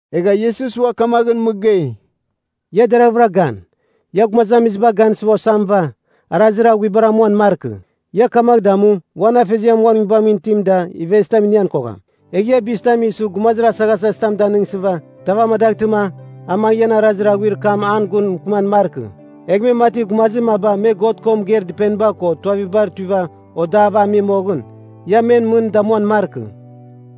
Egha Iesus ua kamaghɨn mɨgei, “Ia deraghvɨra gan. Ia gumazamiziba gansɨ osamɨva, arazir aghuibar amuan markɨ. Ia kamagh damu, uan Afeziar uan Nguibamɨn itim da ivezitam inighan kogham. “Egh ia bizitam isɨ gumazir asaghasazitam danɨngsɨva, tav amadaghtɨma a mangɨ ian arazir aghuir kam an gun mɨkɨman markɨ, egh mati gumazir maba me God ko mɨgeir dɨpeniba ko tuavibar tuiva odava ami moghɨn. Ia men mɨn damuan markɨ.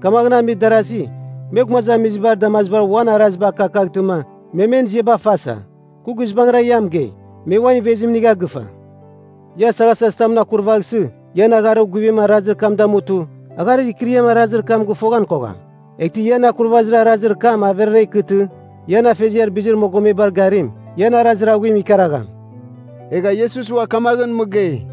Kamagh amir darazi, me gumazamizibar damazibar uan araziba akakaghtɨma, me men ziaba fasa. Kɨ guizbangɨra ia mɨgei, me uan ivezim inigha gɨfa. Ia asaghasazitamɨn akurvaghsɨ, ian agharir guvim arazir kam damutɨ, agharir ikɨriam arazir kam gɨfoghan kogham. Eghtɨ ian akurvazir arazir kam averara ikɨtɨ, ian Afeziar bizir mogomebar garim, ian arazir aghuim ikaragham.” Egha Iesus ua kamaghɨn mɨgei,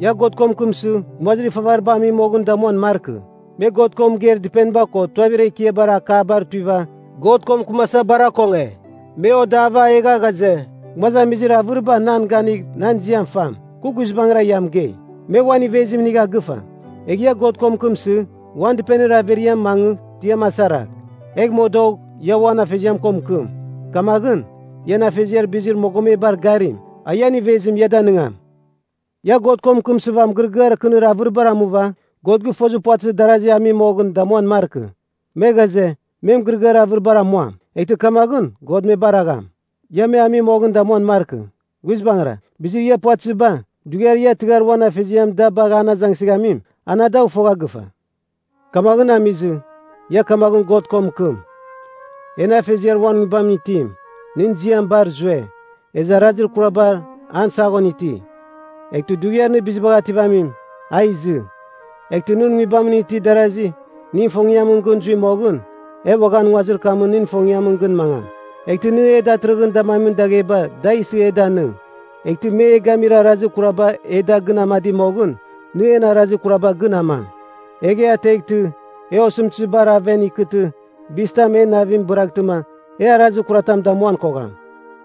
“Ia God ko mɨkɨmsɨ, gumazir ifavariba ami moghɨn damuan markɨ. Me God ko mɨgeir dɨpeniba ko tuavir ekiabar akabar tuiva, God ko mɨkɨmasa bar akonge. Me odava, egha ghaze, gumazamizir avɨriba nan ganigh nan ziam fam. Kɨ guizbangɨra ia mɨgei, me uan ivezim inigha gɨfa. Egh ia God ko mɨkɨmsɨ, uan dɨpenir averiamɨn mangɨ tiam asaragh, egh modogh ia uan Afeziam ko mɨkɨm. Kamaghɨn, ian Afeziar bizir mogomebar garim, a ian ivezim ia danɨngam. “Ia God ko mɨkɨmsɨva mɨgɨrɨgɨar kɨnir avɨribar amuva, God gɨfozir puvatɨzir darazi ami moghɨn damuan markɨ. Me ghaze, me mɨgɨrɨgɨar avɨribar amuam, eghtɨ kamaghɨn God me baragham. Ia me ami moghɨn damuan markɨ. Guizbangɨra, bizir ia puvatɨziba, dughiar ia tɨghar uan Afeziam da bagh an azangsɨghamim, ana dagh fogha gɨfa. “Kamaghɨn amizɨ, ia kamaghɨn God ko mɨkɨm: ‘En Afeziar uan Nguibamɨn itim, nɨn ziam bar zue, ezɨ arazir kuraba an saghon iti. Eghtɨ Dughiar Nɨ Bizibagh Ativamim, a izɨ. Eghtɨ nɨn Nguibamɨn itir darasi nɨn ifongiamɨn gɨn zui moghɨn, e uaghan nguazir kamɨn nɨn ifongiamɨn gɨn mangam. Eghtɨ nɨ e datɨrɨghɨn damamin dagheba da isɨ e danɨng. Eghtɨ me e gamir arazir kuraba e da gɨn amadi moghɨn, nɨ en arazir kuraba gɨn amang. Egh e ateghtɨ, e osɨmtɨzibar aven ikɨtɨ bizitam en navim bɨraghtɨma, e arazir kuratam damuan kogham.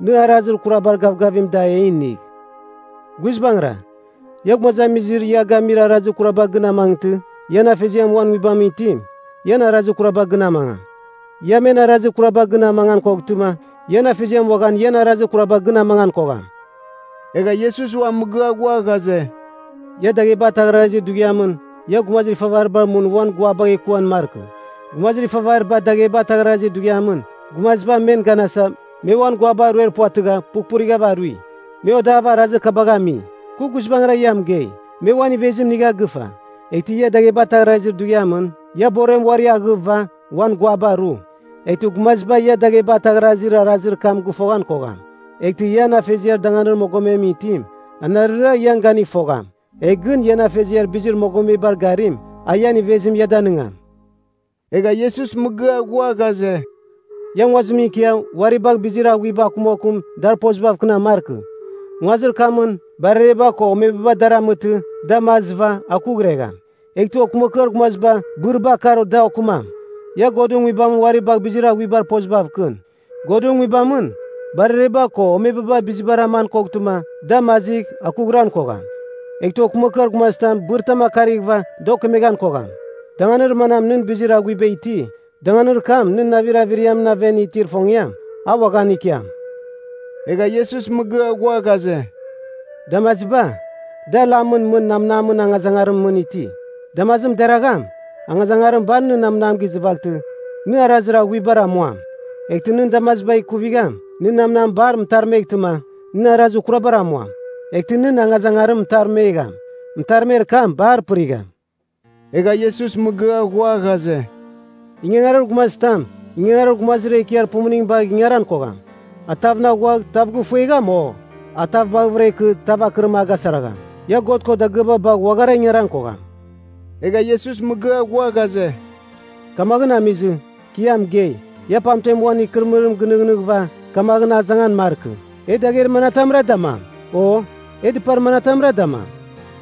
Nɨ arazir kurabar gavgavim da e inigh.’ “Guizbangɨra, ia gumazamiziba ia gamir arazir kuraba gɨn amangtɨ, ian Afeziar uan Nguibamɨn itim, ian arazir kuraba gɨn amangam. Ia men arazir kuraba gɨn amangan koghtɨma, ian Afeziam uaghan ian arazir kuraba gɨn amangan kogham.” Egha Iesus ua mɨgɨa ghua ghaze, “Ia dagheba ataghrazir dughiamɨn ia gumazir ifavaribar mɨn uan guabagh ekuan markɨ. Gumazir ifavariba dagheba ataghrazir dughiamɨn, gumaziba men ganasa, me uan guaba ruer puvatɨgha pughpurighav arui. Me odava arazir kabagh ami. Kɨ guizbangɨra ia mɨgei, me uan ivezim inigha gɨfa. Eghtɨ ia dagheba ataghrazir dughiamɨn, ia borem uari aghɨva uan guaba ru, eghtɨ gumaziba ia dagheba ataghrazir arazir kam gɨfoghan kogham. Eghtɨ ian Afeziar danganir mogomemɨn itim, anarɨra ian ganigh fogham. Egh gɨn ian Afeziar bizir mogomebar garim, a ian ivezim ia danɨngam.” Egha Iesus mɨgɨa ghua ghaze, “Ia nguazimɨn ikia uari bagh bizir aghuiba akumakum dar pozibav kɨnam markɨ. Nguazir kamɨn, barereba ko omebaba dar amɨtɨ, da mazɨva akughregham. Eghtɨ okɨmakɨar gumaziba bɨriba akar da okɨmam. Ia Godɨn Nguibamɨn uari bagh bizir aghuiba pozibav kɨn. Godɨn Nguibamɨn barereba ko omebaba bizibar aman koghtɨma, da mazigh, akughran kogham. Eghtɨ okɨmakɨar gumazitam bɨritam akarighɨva da okemeghan kogham. Danganir manam nɨn bizir aghuiba iti, danganir kam nɨn navir averiamɨn aven itir ifongiam, a uaghan ikiam.” Egha Iesus mɨgɨa ghua ghaze, “Damaziba, da lamɨn mɨn namnamɨn angazangarimɨn mɨn iti. Damazim deragham, angazangarim bar nɨn namnam gizɨvaghtɨ, nɨ arazir aghuibar amuam. Eghtɨ nɨn damaziba ikuvigham, nɨn namnam bar mɨtarmeghtɨma, nɨ arazir kurabar amuam. Eghtɨ nɨn angazangarim mɨtarmegham, mɨtarmer kam bar pɨrigham.” Egha Iesus mɨgɨa ghua ghaze, “Ingangarir gumazitam, ingangarir gumazir ekiar pumuning bagh ingaran kogham. A tavɨn aghuagh, tav gifuegham. O, a tav baghɨvɨra ikɨ, tav akɨrim a gasaragham. Ia God ko dagɨaba bagh uaghara ingaran kogham.” Egha Iesus mɨgɨa ghua ghaze, “Kamaghɨn amizɨ, kɨ ia mɨgei, ia pamten uan ikɨrɨmɨrim gɨnɨghnɨghɨva, kamaghɨn azangan markɨ, e dagher manatamra damam, o e dɨpar manatamra damam?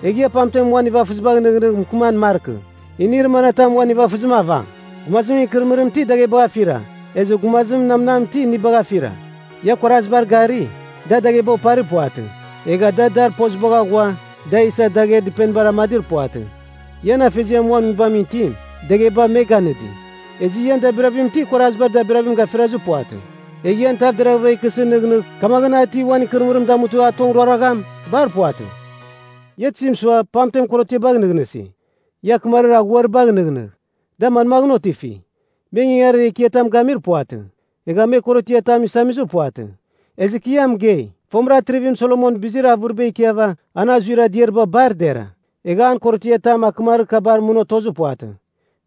Egh ia pamten uan nivafɨzibagh nɨghnɨgh mɨkɨman markɨ, inir manatam uan nivafɨzim avam? Gumazimɨn ikɨrɨmɨrim ti daghebagh afira, ezɨ gumazimɨn namnam ti inibagh afira. Ia kuarazibar gari, da dagheba oparir puvatɨ, egha da dar pozibagh aghua da isa dagher dɨpenibar amadir puvatɨ. Ian Afeziar uan Nguibamɨn itim, dagheba me ganɨdi. Ezɨ ian dabirabim ti kuarazibar dabirabim gafirazir puvatɨ? Egh ian tav deraghvɨra ikɨsɨ nɨghnɨgh kamaghɨn a ti uan ikɨrɨmɨrim damutɨ a tong ruaragham? Bar puvatɨ. “Ia tizim sua, pamten korotiabagh nɨghnɨsi? Ia akɨmarir aghuaribagh nɨghnɨgh. Da manmaghɨn otifi? Me ingangarir ekiatam gamir puvatɨ. Egha me korotiatam isamizir puvatɨ. Ezɨ kɨ ia mɨgei, fomɨra Atrivim Solomon bizir bar avɨriba ikiava an azuir adiariba bar dera, egha an korotiatam akɨmarir kabar mɨn otozir puvatɨ.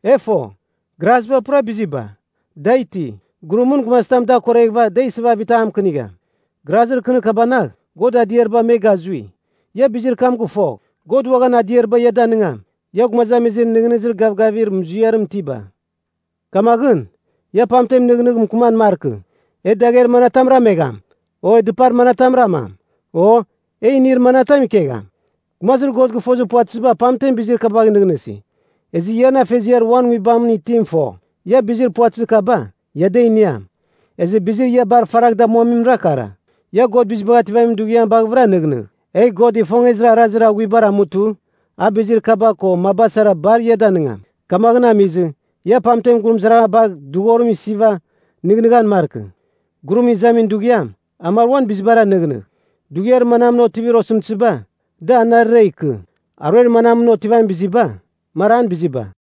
E fo, graziba pura biziba, da iti, gurumɨn gumazitam dar akoreghɨva da isɨva avitam mɨkɨnigham. Grazir kɨnir kabanagh God adiariba me gazui. Ia bizir kam gɨfogh, God uaghan adiariba ia danɨngam. Ia gumazamizir nɨghnɨzir gavgavir muziarim itiba! Kamaghɨn, ia pamten nɨghnɨgh mɨkɨman markɨ, ‘E dagher manatam ramegham? O, dɨpar manatam ramam? O, e inir manatam ikegham?’ Gumazir God gɨfozir puvatɨziba pamten bizir kabagh nɨghnɨsi. Ezɨ ian Afeziar uan Nguibamɨn itim fo, ia bizir puvatɨzir kaba, ia da iniam. Ezɨ bizir ia bar faragh damuamimra kara: Ia God Bizibagh Ativamin Dughiam baghɨvɨra nɨghnɨgh, egh God ifongezir arazir aghuibar amutɨ, a bizir kaba ko maba sara bar ia danɨngam. Kamaghɨn amizɨ, ia pamten gurumɨzaraghan bagh dɨghorim isiva nɨghnɨghan markɨ. Gurum izamin dughiam, a mar uan bizibara nɨghnɨgh. Dughiar manamɨn otivir osɨmtɨziba, da anarɨra ikɨ. Aruer manamɨn otivamin biziba, mar an biziba.”